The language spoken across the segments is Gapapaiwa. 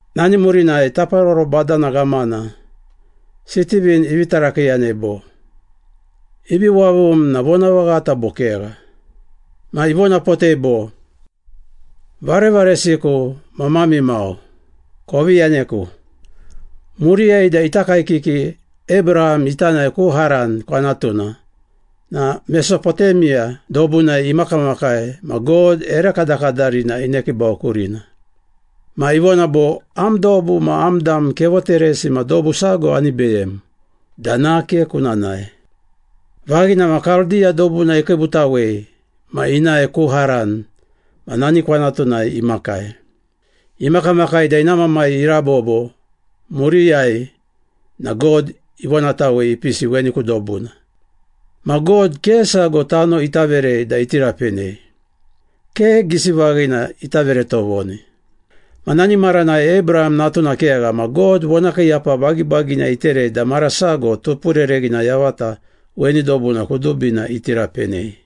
Nani murinai taparoro badana ghamana, Sitivin ivi tarakiiyanei bo, “Ivi wavum na vonavaghata bo kegha?” Ma ivonapotei bo, “Varevaresiku ma mami mau, kovi yaneku. Muriyai da ita kaekiki Abraham ita nae ku Haran kwanatuna na Mesopotemiya dobunai imakamakai ma God ere kadakadarina inekiibau kurina. Ma ivona bo, ‘Am dobu ma am dam kevoteresi ma dobu sago ani beyem da nake kuna nae.’ Vaghina ma Kaldiya dobuna ikiibutawei ma inae ku Haran ma nani kwanatunai imakai. Imakamakai da ina mamai irabobo, muriyai na God ivonatawei ipisi weni ku dobuna. Ma God ke sago tano ita verei da iti rapenei. Ke gisi vaghina ita vere tovoni. Ma nani maranai Abraham natuna kegha ma God vonakiiyapa bagibagina iterei da mara sago tupurereghina yavata weni dobuna kudubina iti rapenei.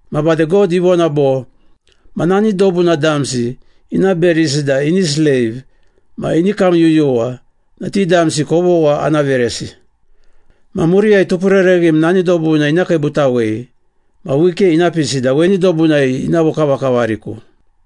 Ma bade God ivona bo, ‘Ma nani dobuna damsi ina berisi da ini sleiv ma ini kamyuyuwa na ti damsi kovogha ana veresi. Ma muriyai tupurereghim nani dobuna ina kiibutawei ma wike ina pisi da weni dobunai ina vokavakavariku.’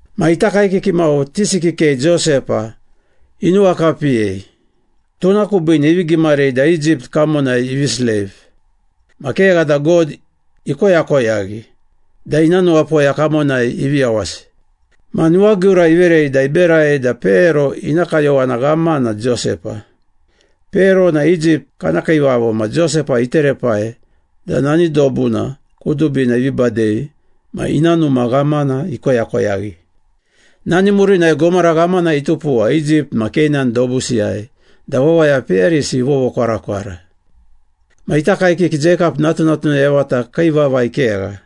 “Ma ita kaekiki mau tisi kikei Josepa inuwakapiyei, tuna kubiine ivi gimarei da Egypt kamonai ivi sleiv. Ma kegha da God ikoyakoyaghi da ina nuwapoya kamonai ivi yawasi. Ma nuwagiura iverei ma iberai da Pero ina kayowana ghamana Josepa. Pero na Egypt kana kiivavo ma Josepa iterepai da nani dobuna kudubina ivi badei ma ina numa ghamana ikoyakoyaghi. Nani murinai gomara ghamana itupuwa Egypt ma Keinan dobusiyai da wawaya peyarisi ivovokwarakwara. Ma ita kaekiki Jeikap natunatuna yavata kii vavai kegha.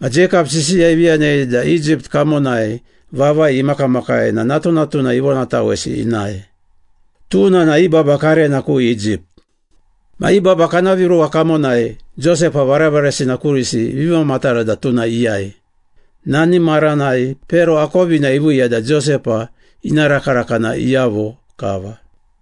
Ma Jeikap sisiya ivi yanei da Egypt kamonai vavai imakamakai na natunatuna ivonatawesi inae. Tuna na i baba karena ku Egypt. Ma i baba kana viruwa kamonai Josepa varevaresina kurisi ivi mamatara da tuna iyai. Nani maranai Pero akovina iviiya da Josepa ina rakaraka na iyavo kava.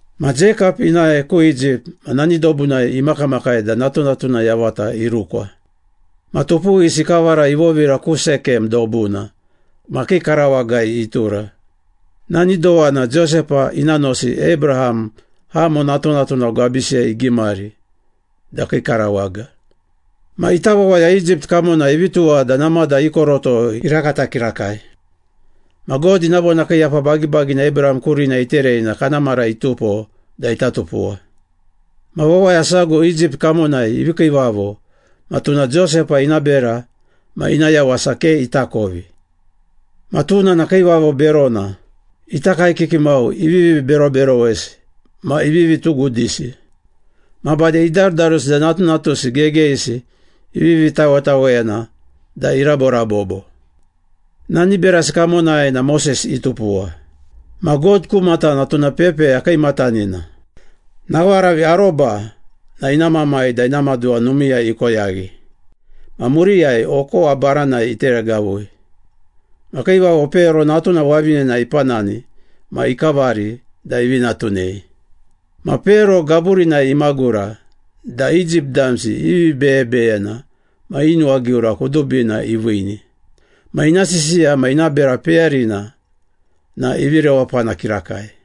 Ma Jeikap inae ku Egypt ma nani dobunai imakamakai da natunatuna yavata irukwa. Ma tupuwisi ikavara ivovira ku Sekem dobuna ma kii karawagai itura. Nani dowana Josepa ina nosi Abraham, Hamo natunatuna gwabisiyai igimari da kii karawaga.” “Ma ita wawaya Egypt kamonai ivi tuwa da namada i koroto irakata kirakai. Ma God ina vonakiiyapa bagibagina Abraham kurina iterei na kana mara itupo da ita tupuwa. Ma wawaya sago Egypt kamonai ivi kiivavo ma tuna Josepa ina bera ma ina yawasa ke itakovi. Ma tuna na kiivavo berona, ita kaekiki mau ivivi beroberowesi ma ivivi tugudisi. Ma bade idarudarusi da natunatusi gegeyisi ivivi tawetaweyana da iraborabobo. Nani berasi kamonai na Moses itupuwa, ma God ku matana tuna pepeya kiimatanina. Nawaravi aroba na ina mamai da ina maduwa numiiyai ikoyaghi, ma muriyai okowa baranai iteregavui. Ma Kiivavo Pero natuna wavinena ipanani ma ikavari da ivi natunei. Ma Pero gaburinai imagura da Egypt damsi i vibeyebeyena ma i nuwagiura kudubina iviini. Ma ina sisiya ma ina bera peyarina na ivi rewapana kirakai.”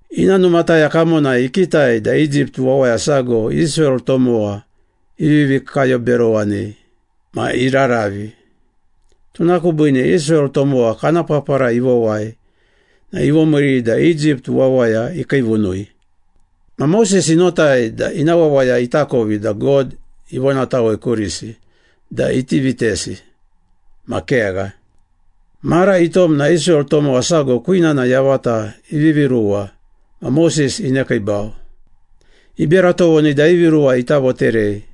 Ina numataya kamonai ikitai da Egypt wawaya sago Israel tomowa ivivi kayoberowanei ma iraravi. Tuna kubiine Israel tomowa kana papara ivowai na ivomiiri da Egypt wawaya ikiivunui. Ma Moses inotai da ina wawaya itakovi da God ivonatawei kurisi da iti vitesi, ma kegha. Mara itom na Israel tomowa sago kwinana yavata ivivi ruwa ma Moses inekiibau. Ibera tovoni da i viruwa ita voterei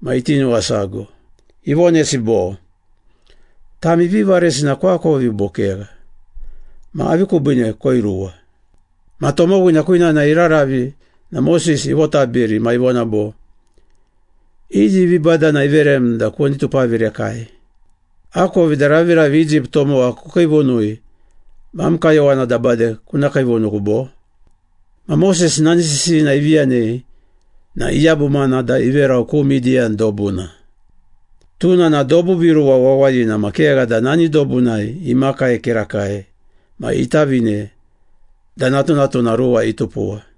ma iti nuwasago. Ivonesi bo, ‘Tami vivaresina koakovi bo kegha, ma avi kubiine koiruwa?’ Ma tomowina kwinana iraravi na Moses ivotabiri ma ivona bo, ‘Iyi vibadana iverem da kuni tupavirekai? Akovi da raviravi Egypt tomowa kukiivunui ma am kayowana da bade kuna kiivunuku, bo?’ Ma Moses nani sisiyina ivi yanei na iyabumana da iverau ku Midiyan dobuna. Tuna na dobu viruwa wawayina ma kegha da nani dobunai imakai kirakai ma itavine da natunatuna ruwa itupuwa.”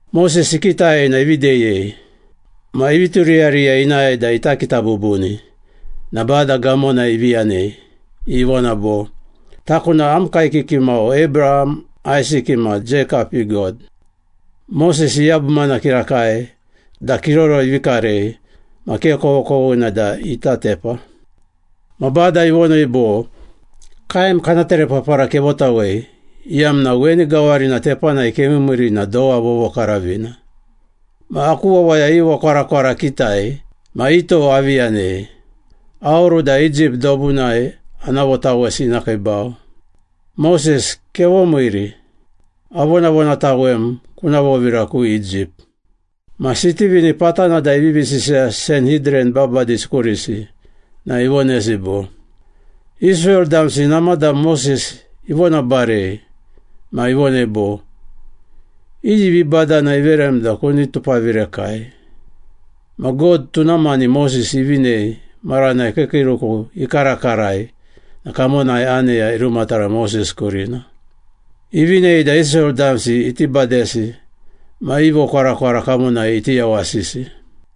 Moses ikitai na ivi deyei. Ma ivi turiyariya inae da ita kita bubuni na Bada gamona ivi yanei, ivona bo, ‘Taku na am kaekiki mau Abraham, Aisiki ma Jeikap i God.’ Moses iyabumana kirakai da kiroro ivi karei ma ke kovokovoghina da ita tepa. Ma Bada ivonei bo, ‘Kaem kana terepapara kevotawei, iyamna weni gawarina tepanai kemiimiiri na dowa vovokaravina. Ma aku wawaya i vokwarakwara akitai ma i tou avi yanei. Aoru da Egypt dobunai ana votawesi ina kiibau. Moses, kevomiiri. Avonavonatawem kuna vovira ku Egypt.’” Ma Sitivin patana da ivivi sisiya Sanhidran babadisi kurisi na ivonesi bo, “Israel damsi namada Moses ivonabarei ma ivonei bo, ‘Iyi vibadana iverem da kuni tupavirekai?’ Ma God tuna mani Moses ivinei maranai kiikiiruku ikarakarai na kamonai aneya irumatara Moses kurina. Ivinei da Israel damsi iti badesi ma i vokwarakwara kamonai iti yawasisi.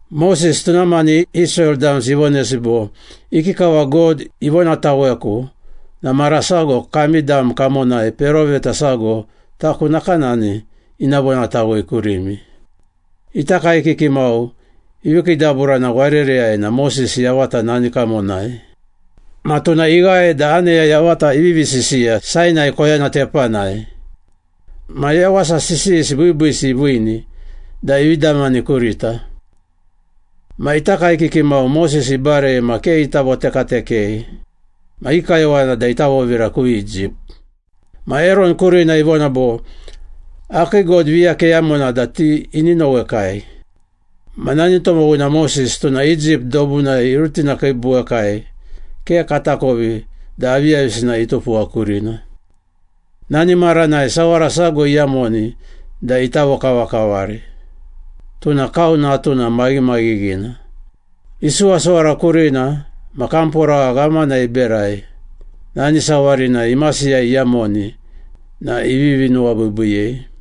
Moses tuna mani Israel damsi ivonesi bo, ‘Ikikava God ivonataweku na mara sago kami dam kamonai peroveta sago taku nakanani ina vonatawei kurimi.’ Ita kaekiki mau ivi kiidaburana warereyai na Moses yavata nani kamonai. Ma tuna ighae da aneya yavata ivivi sisiya Sainai koyana tepanai. Ma yawasa sisiyisi biibiisi iviini da ivi damani kurita.” “Ma ita kaekiki mau Moses ibarei ma ke ita votekatekei. Ma i kayowana da ita vovira ku Egypt. Ma Eron kurina ivona bo, ‘Akii god viya keyamona da ti ini nowekai. Ma nani tomowina Moses, tuna Egypt dobunai irutinakiibuwekai, ke katakovi da aviyavisina itupuwa kurina.’ Nani maranai sawara sago iyamoni da ita vokavakavari, tuna kau natuna maghimaghighina. Isuwasuwara kurina, ma kamporagha ghamana iberai, nani sawarina imasiyai iyamoni na ivivi nuwabiibiiyei.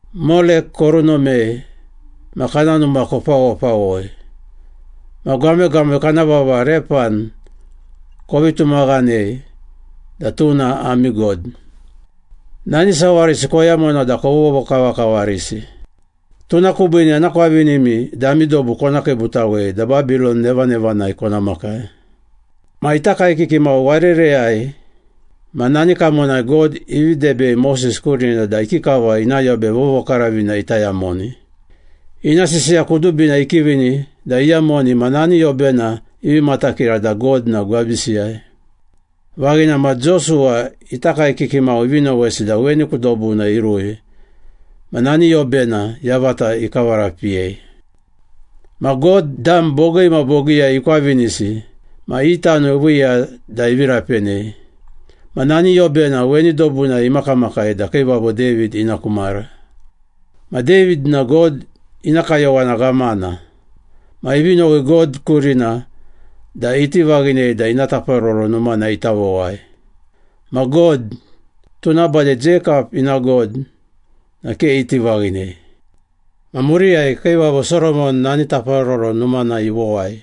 Molek korunomei ma kana numa kopawopawoi, ma gwamegwame kana vava Repan kovi tumaghanei da tuna ami god, Nani sawarisi koyamona da kovovokavakavarisi. Tuna kubiine ana kwavinimi da ami dobu kona kiibutawei da Babilon nevanevanai kona makai.’” “Ma ita kaekiki mau warereyai ma nani kamonai God ivi debei Moses kurina da ikikava ina Yobe Vovokaravina ita yamoni. Ina sisiya kudubina ikivini da iyamoni ma nani yobena ivi matakira da God na gwabisiyai. Vaghina ma Josuwa ita kaekiki mau ivi nowesi da weni ku dobuna irui ma nani yobena yavata ikavarapiyei. Ma God dam bogii ma bogiiyai ikwavinisi ma i tano iviiya da ivi rapenei. Ma nani yobena weni dobunai imakamakai da Kiivavo David ina ku mara. Ma David na God ina kayowana ghamana. Ma ivi nowi God kurina da iti vaghinei da ina Taparoro Numana ita vowai. Ma God, tuna bade Jeikap ina God na ke iti vaghinei. Ma muriyai Kiivavo Soromon nani Taparoro Numana ivowai.”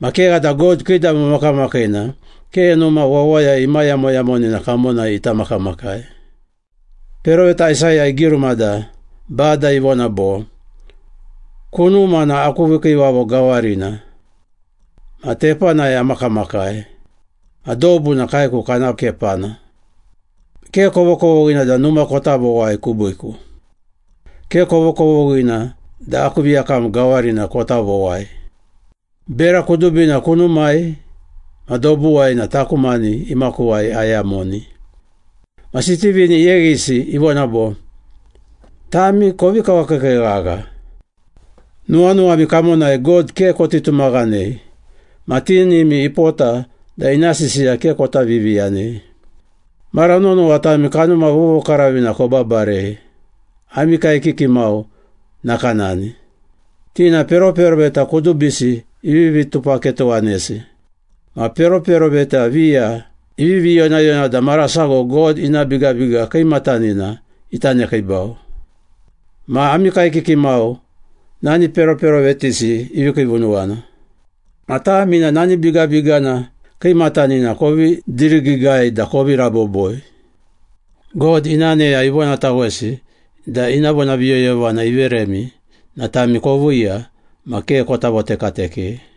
“Ma kegha da God Kiidamo Makamakiina ke numa wawaya imayamoyamonina kamonai ita makamakai. Peroveta Aisaya igiruma da Bada ivona bo, ‘Kunuma na aku vikiivavo gawarina. Ma tepanai amakamakai. Ma dobu na kaeku kana kepana. Ke kovokovoghina da numa kota vowai kubiiku. Ke kovokovoghina da aku viyakam gawarina kota vowai. Bera kudubina kunumai ma dobuwai na taku mani imakuwai ayamoni.’” Ma Sitivin iyeghisi, ivona bo, “Tami kovi kawakiikii ghagha! Nuwanuwami kamonai God ke koti tumaghanei ma tinimi ipota da ina sisiya ke kota viviyanei. Mara nonowa tami Kanuma Vovokaravina kobabarei, ami kaekiki mau nakanani! Ti na peroperoveta kudubisi ivivi tupaketowanesi. Ma peroperoveta viya ivivi yonayona da mara sago God ina Bigabiga Kiimatanina ita nekiibau. Ma ami kaekiki mau nani peroperovetisi ivi kiivunuwana. Ma tami na nani Bigabigana Kiimatanina kovi dirigiigai da kovi raboboi. God ina aneya ivonatawesi da ina vonaviyoyovana iveremi na tami koviiya ma ke kota votekatekei.”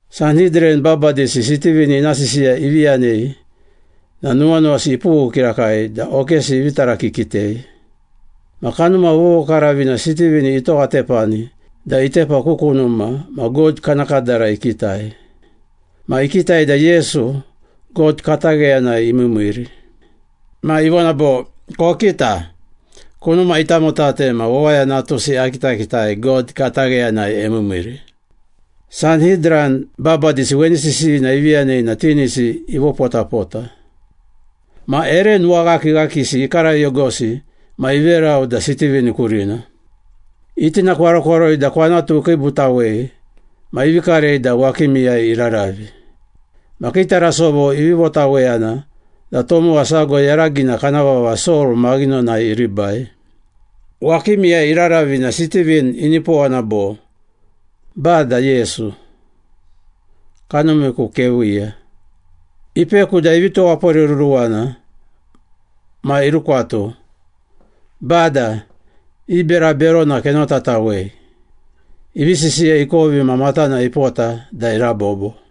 Sanhidran babadisi Sitivin ina sisiya ivi yanei na nuwanuwasi ipughu kirakai da okesi ivi tarakikitei. Ma Kanuma Vovokaravina Sitivin itowatepani da itepa ku kunuma ma God kana kadara ikitai. Ma ikitai da Yesu, God katagheyanai imiimiiri. Ma ivona bo, “Kokita! Kunuma itamotate ma Wawaya Natusi akitakitai God katagheyanai emiimiiri.” Sanhidran babadisi weni sisiyina ivi yanei na tinisi ivopotapota. Ma ere nuwaghakighakisi ikarayogosi ma iverau da Sitivin kurina. Itinakwarokwaroi da kwanatu ikiibutawei ma ivi karei da wakimiyai iraravi. Ma kii tarasovo ivi votaweyana da tomowa sago yaragina kana vava Sol maghinonai iribai. Wakimiiyai iraravi na Sitivin inipowana bo, “Bada Yesu, kanumiku keviiya.” Ipeku da ivi tuwaporeruruwana ma irukwatu, “Bada, i bera berona kenotatawei.” Ivi sisiya ikovi ma matana ipota da irabobo.